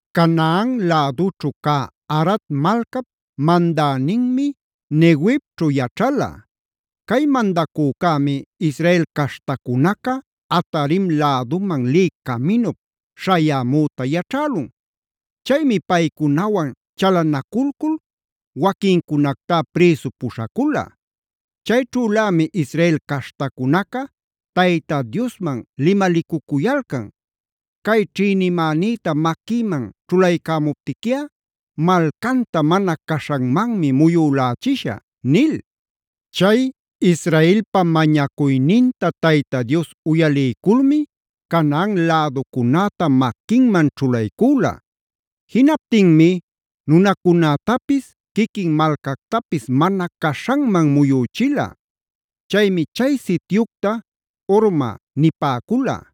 Canaan lädućhu cä Arad malcap mandäninmi Neguevćhu yaćhala. Cay mandacücämi Israela caśhtacunaca Atarim läduman lï caminup śhayämüta yaćhälun. Chaymi paycunawan chalanaculcul waquincunactá prïsu puśhacula. Chayćhülämi Israel caśhtacunaca Tayta Diosman limalicucuyalcan: “Cay ćhïnimänïta maquïman ćhulaycamuptiquiꞌa malcanta mana caśhanmanmi muyülächishä” nil. Chay Israelpa mañacuyninta Tayta Dios uyaliyculmi Canaan läducunäta maquinman ćhulaycüla. Jinaptinmi nunacunätapis, quiquin malcactapis mana caśhanman muyüchila. Chaymi chay sityucta Hormab nipäcula.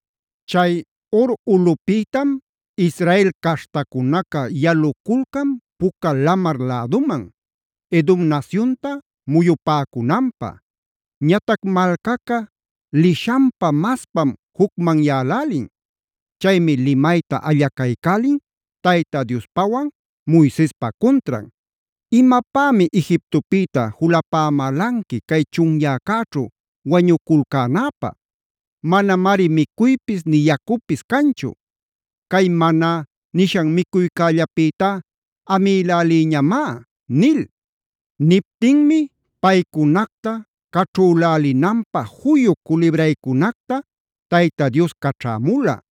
Chay Hor ulꞌupïtam Israel caśhtacunaca yaluculcan Puca Lamar läduman, Edomc nasyunta muyupäcunanpä. Ñatac malcaca lishanmaspam jucmanyälälin. Chaymi limayta allacaycälin Tayta Diospawan Moisespa cuntran: “¿Imapämi Egiptopïta julapamälanqui cay chunyäcäćhu wañuculcänäpä? Manamari micuypis nï yacupis canchu. Cay Maná nishan micuycällapïtá amïlälïñamá” nil. Niptinmi paycunacta caćhülälinanpä juyu culibraycunacta Tayta Dios caćhämula.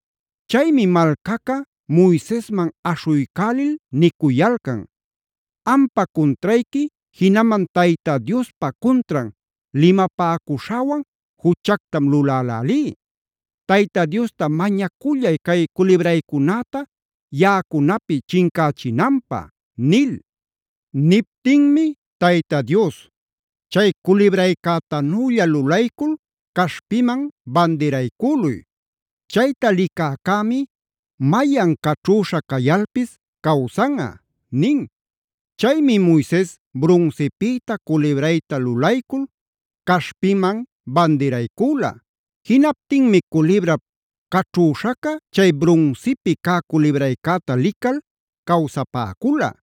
Chaymi malcaca Moisesman aśhuycälil nicuyalcan: “Ampa cuntrayqui, jinaman Tayta Diospa cuntran limapäcuśhäwan juchactam lulälälí. Tayta Diosta mañacullay cay culibraycunäta yaꞌacunapi chincachinanpä” nil. Niptinmi Tayta Dios: “Chay culibraycätanülla lulaycul caśhpiman bandiraycüluy. Chayta licäcämi mayan caćhüśha cayalpis cawsanꞌa” nin. Chaymi Moises brunsipïta culibrayta lulaycul caśhpiman bandiraycüla.e Jinaptinmi culibrap caćhüśhaca chay brunsipi cä culibraycäta lical cawsapäcula.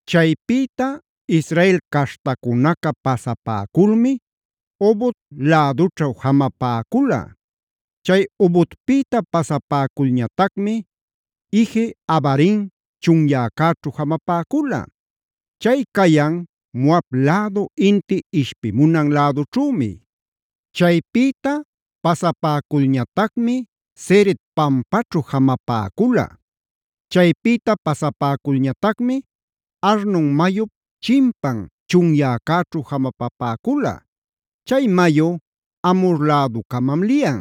Chaypïta Israel caśhtacunaca pasapäculmi Obot lädućhu jamapäcula. Chay Obotpïta pasapäculñatacmi Ije-abarim chunyäcäćhu jamapäcula. Chay cayan Moab lädu inti ishpimunan lädućhümi. Chaypïta pasapäculñatacmi Zered pampaćhu jamapäcula. Chaypïta pasapäculñatacmi Arnon mayup chimpan chunyäcäćhu jamapapäcula; chay mayu Amhor läducamam liyan.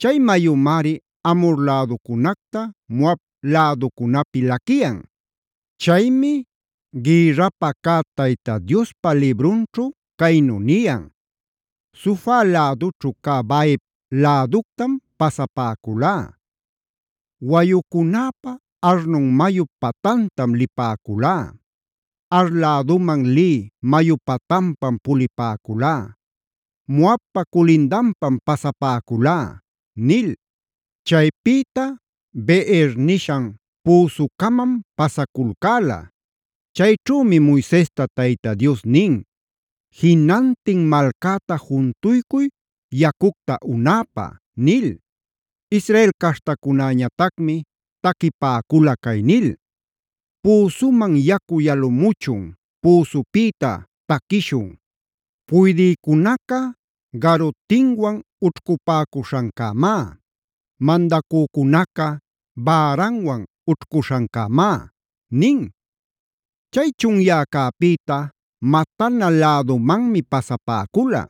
Chay mayumari Amhor läducunacta Moab läducunapi laquiyan. Chaymi gïrrapä cä Tayta Diospa librunćhu caynu niyan: “Sufaf lädućhu cä Vaheb läductam pasapäculá; wayucunäpa, Arnon mayup patantam lipäculá. Ar läduman lï mayu patanpam pulipäculá; Moabpa culindanpam pasapäculá” nil. Chaypïta Beer nishan püsucamam pasaculcäla. Chayćhümi Moisesta Tayta Dios nin: “Jinantin malcäta juntuycuy yacucta unäpä” nil. Israel caśhtacunäñatacmi taquipäcula cay nil: “¡Püsuman yacu yalamuchun! ¡Püsupïta taquishun! Puydïcunaca garutinwan ućhcupäcuśhancämá; mandacücunaca bäranwan ućhcuśhancämá” nin. Chay chunyäcäpïta Matana lädumanmi pasapäcula.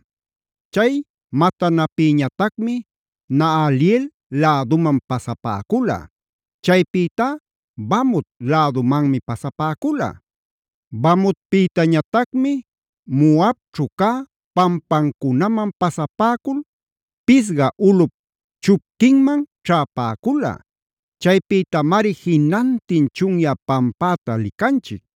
Chay Matanapïñatacmi Nahaliel läduman pasapäcula; chaypïtá Bamot lädumanmi pasapäcula. Bamotpïtañatacmi Moabćhu cä pampancunaman pasapäcul Pisga ulꞌup chupquinman ćhäpäcula; chaypïtamari jinantin chunyä pampäta licanchic.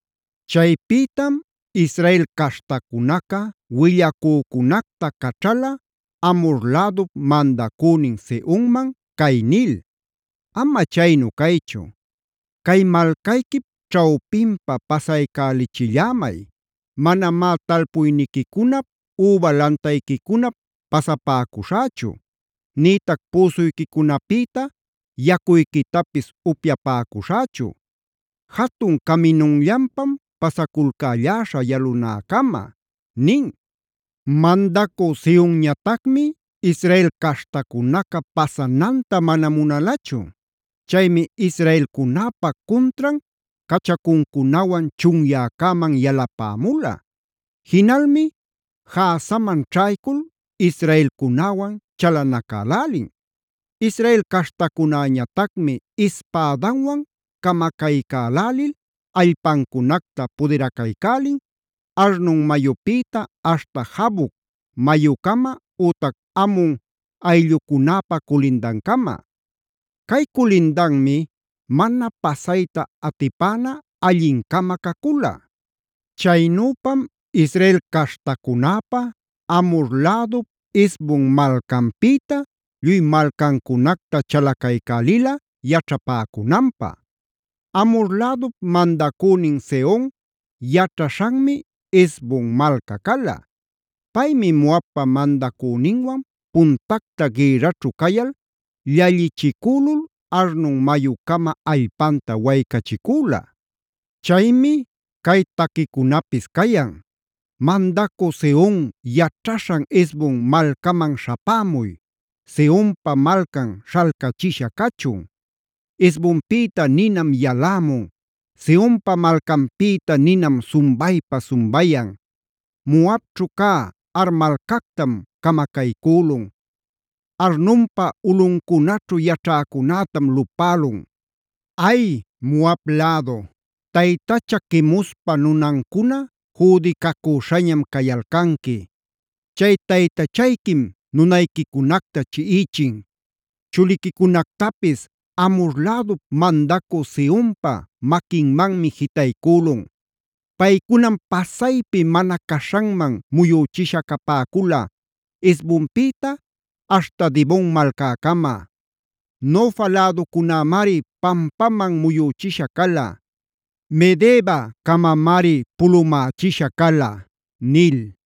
Chaypïtam Israel caśhtacunaca willacücunacta caćhala Amhor lädup mandacünin Sehonman cay nil: “Ama chaynu caychu, cay malcayquip ćhawpinpa pasaycälichillämay. Manamá talpuyniquicunap üba lantayquicunap pasapäcuśhächu, nïtac püsuyquicunapïta yacuyquitapis upyapäcuśhächu. Jatun caminunllanpam pasaculcälläśhä yalunäcama” nin. Mandacü Sehonñatacmi Israel caśhtacunaca pasananta mana munalachu. Chaymi Israelcunäpa cuntran cachacuncunawan chunyäcäman yalapämula. Jinalmi Jahazaman ćhaycul israelcunäwan chalanacälälin. Israel caśhtacunäñatacmi ispädanwan camacaycälälil allpancunacta pudiracaycälin, Arnon mayupïta aśhta Jaboc mayucama ütac Amon ayllucunäpa culindancama. Cay culindanmi mana pasayta atipäna allin-cama cacula. Chaynüpam Israel caśhtacunäpa, Amhor lädup Hesbon malcanpïta lluy malcancunacta chalacaycälila yaćhapäcunanpä. Amhor lädup mandacünin Sehon yaćhaśhanmi Hesbon malca cala. Paymi Moabpa mandacüninwan puntacta gïrraćhu cayal llallichicülul Arnon mayucama allpanta waycachicüla. Chaymi cay taquicunapis cayan: “¡Mandacü Sehon yaćhaśhan Hesbon malcaman śhapämuy! ¡Sehonpa malcan śhalcachisha cachun! Hesbonpïta ninam yalämun; Sehonpa malcanpïta ninam sumbaypa sumbayan. Moabćhu cä Ar malcactam camacaycülun; Arnonpa ulꞌuncunaćhu yaćhäcunätam lupälun. ¡Ay, Moab lädu! ¡Taytacha Quemospa nunancuna jüdicacüśhañam cayalcanqui! Chay taytachayquim nunayquicunacta chiꞌichin; chuliquicunactapis Amhor lädup mandacü Sehonpa maquinmanmi jitaycülun. Paycunam pasaypi mana caśhanman muyüchisha capäcula, Hesbonpïta aśhta Dibon malcäcama; Nofa läducamamari pampaman muyüchisha cala; Medebacamamari pulumächisha cala” nil.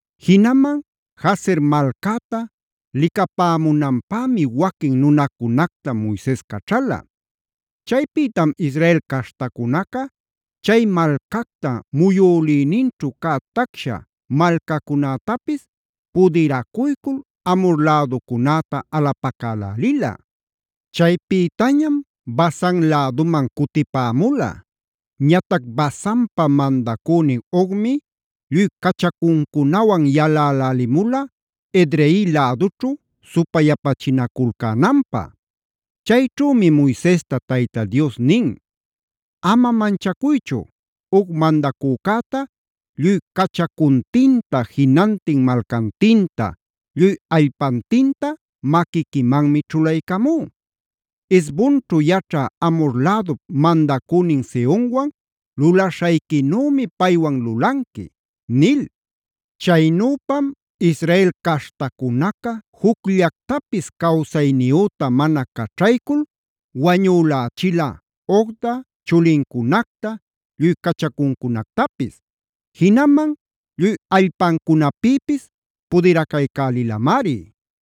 Jinaman Jazer malcäta licapämunanpämi waquin nunacunacta Moises caćhala. Chaypïtam Israel caśhtacunaca chay malcacta muyülïninćhu cä tacsha malcacunätapis pudiracuycul Amhor läducunäta alapacälälila. Chaypïtañam Basan läduman cutipämula. Ñatac Basanpa mandacünin Ogmi lluy cachacuncunawan yalälälimula Edrei lädućhu supayapachinaculcänanpä. Chayćhümi Moisesta Tayta Dios nin: “Ama manchacuychu. Og mandacücäta lluy cachacuntinta, jinantin malcantinta, lluy allpantinta maquiquimanmi ćhulaycamú. Hesbonćhu yaćhä Amhor lädup mandacünin Sehonwan lulaśhayquinümi paywan lulanqui” nil. Chaynüpam Israel caśhtacunaca jucllactapis cawsayniyüta mana caćhaycul wañülächila Ogta, chulincunacta, lluy cachacuncunactapis; jinaman lluy allpancunapïpis pudiracaycälilamari.